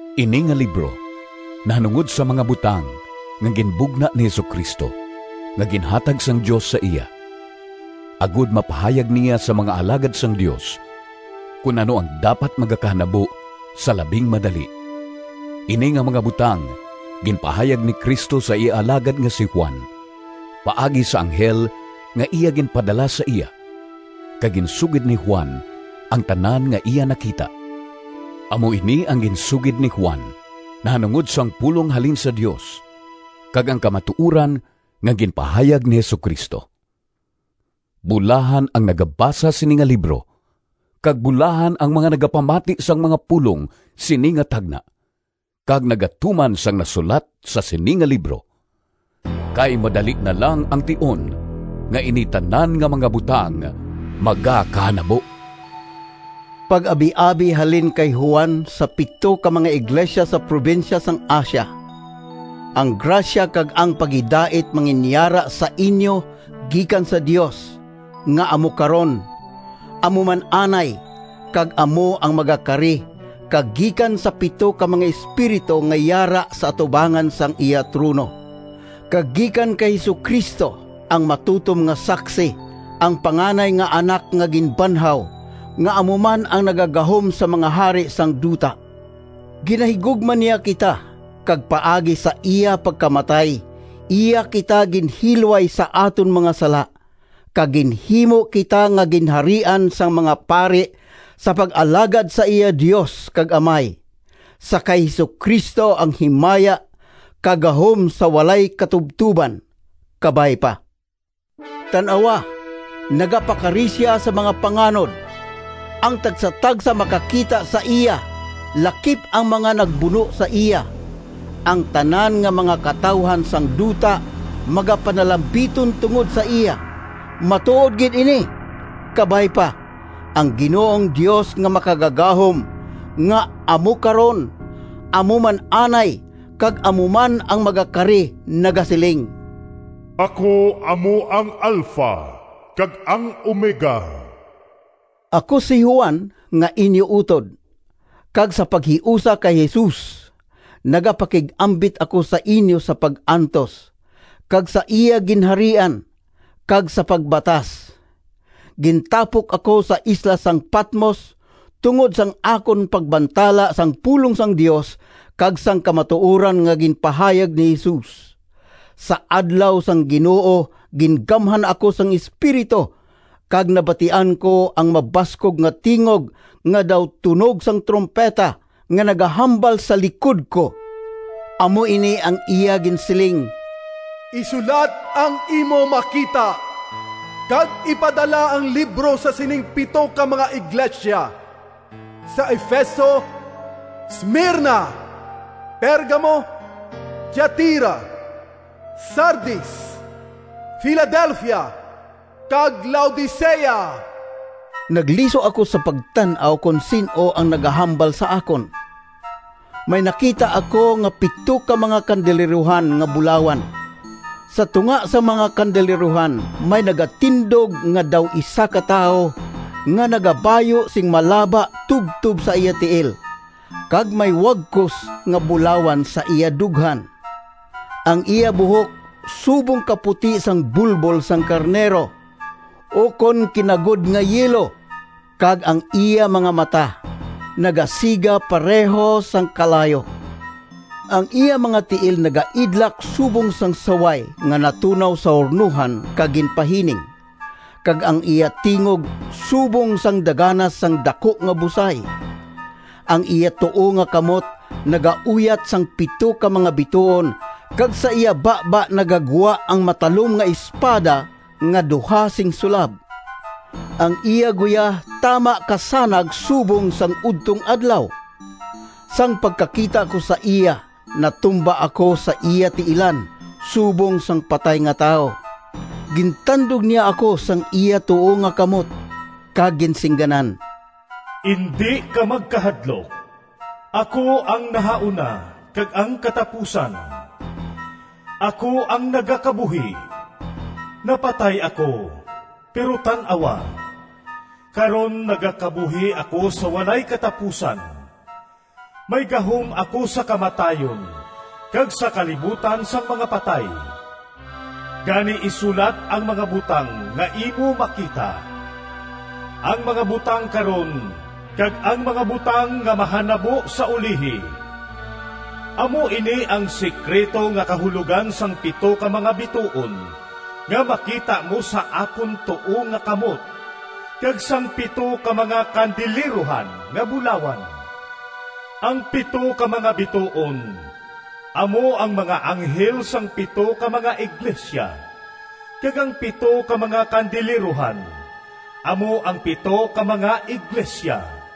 Ini nga libro nahanungod sa mga butang nga ginbugna ni Jesu-Cristo nga ginhatag sang Dios sa iya, agod mapahayag niya sa mga alagad sang Dios kon ano ang dapat magakahanabo sa labing madali. Ini nga mga butang ginpahayag ni Cristo sa iya alagad nga si Juan paagi sa anghel nga iya ginpadala sa iya, kag ginsugid ni Juan ang tanan nga iya nakita. Amo ini ang ginsugid ni Juan nahanungod sang pulong halin sa Dios, kag ang kamatuoran nga ginpahayag ni Jesu-Cristo. Bulahan ang nagabasa sini nga libro, kag bulahan ang mga nagapamati sang mga pulong sini nga tagna kag nagatuman sang nasulat sa sini nga libro! Kay madali na lang ang tion nga ini tanan nga mga butang magakahanabo. Pag-abiabi halin kay Juan sa pito ka mga iglesia sa probinsya sang Asia: Ang grasya kag ang paghidait manginyara sa inyo gikan sa Dios, nga amo karon, amo man anay, kag amo ang magakari, kag gikan sa pito ka mga espiritu nga yara sa atubangan sang iya trono, kag gikan kay Jesu-Cristo, ang matutom nga saksi, ang panganay nga Anak nga ginbanhaw, nga amo man ang nagagahom sa mga hari sang duta. Ginahigugma niya kita, kag paagi sa iya pagkamatay iya kita ginhilway sa aton mga sala, kag ginhimo kita nga ginharian sang mga pari sa pag-alagad sa iya Dios kag Amay. Sa kay Jesu-Cristo ang himaya kag gahom sa walay katubtoban! Kabay pa. Tan-awa, nagapakari sia sa mga panganod! Ang tagsatagsa makakita sa iya, lakip ang mga nagbuno sa iya. Ang tanan nga mga katawuhan sang duta magapanalambiton tungod sa iya. Matuod gid ini! Kabay pa. Ang Ginoong Dios nga Makagagahom, nga amo karon, amo man anay, kag amo man ang magakari nagasiling, “Ako amo ang Alpha kag ang Omega.” Ako si Juan, nga inyo utod, kag sa paghiusa kay Jesus, nagapakig-ambit ako sa inyo sa pag-antos, kag sa iya Ginharian, kag sa pagbatas. Gintapok ako sa isla sang Patmos, tungod sang akon pagbantala sang pulong sang Dios kag sang kamatuoran nga ginpahayag ni Jesus. Sa adlaw sang Ginoo gingamhan ako sang Espiritu, kag nabatian ko ang mabaskog nga tingog nga daw tunog sang trumpeta, nga nagahambal sa likod ko. Amo ini ang iya ginsiling, “Isulat ang imo makita, kag ipadala ang libro sa sining pito ka mga iglesia: sa Efeso, Smirna, Pergamo, Tiatira, Sardis, Filadelfia, kag Laodicea.” Nagliso ako sa pagtan-aw kon sin-o ang nagahambal sa akon. May nakita ako nga pito ka mga kandilerohan nga bulawan. Sa tunga sang mga kandilerohan may nagatindog nga daw isa ka tawo nga nagabayu sing malaba tubtob sa iya tiil, kag may wagkos nga bulawan sa iya dughan. Ang iya buhok subong kaputi sang bulbol sang karnero, ukon kinagod nga yelo, kag ang iya mga mata nagasiga pareho sang kalayo, ang iya mga tiil nagaidlak subong sang saway nga natunaw sa hurnohan kag ginpahining, kag ang iya tingog subong sang daganas sang daku nga busay. Ang iya tuo nga kamot nagauyat sang pito ka mga bituon, kag sa iya baba nagagwa ang matalom nga espada nga duha sing sulab. Ang iya guya tama kasanag subong sang udtong adlaw. Sang pagkakita ko sa iya, natumba ako sa iya tiilan subong sang patay nga tawo. Gintandog niya ako sang iya tuo nga kamot kag ginsingganan, “Indi ka magkahadlok! Ako ang nahauna kag ang katapusan. Ako ang nagakabuhi! Napatay ako, pero tan-awa, karon nagakabuhi ako sa walay katapusan. May gahom ako sa kamatayon kag sa kalibutan sang mga patay. Gani isulat ang mga butang nga imo makita, ang mga butang karon, kag ang mga butang nga mahanabo sa ulihi. Amo ini ang sekrito nga kahulogan sang pito ka mga bituon nga makita mo sa akon tuo nga kamot, kag sang pito ka mga kandilerohan nga bulawan: ang pito ka mga bituon amo ang mga anghel sang pito ka mga iglesia, kag ang pito ka mga kandilerohan amo ang pito ka mga iglesia.”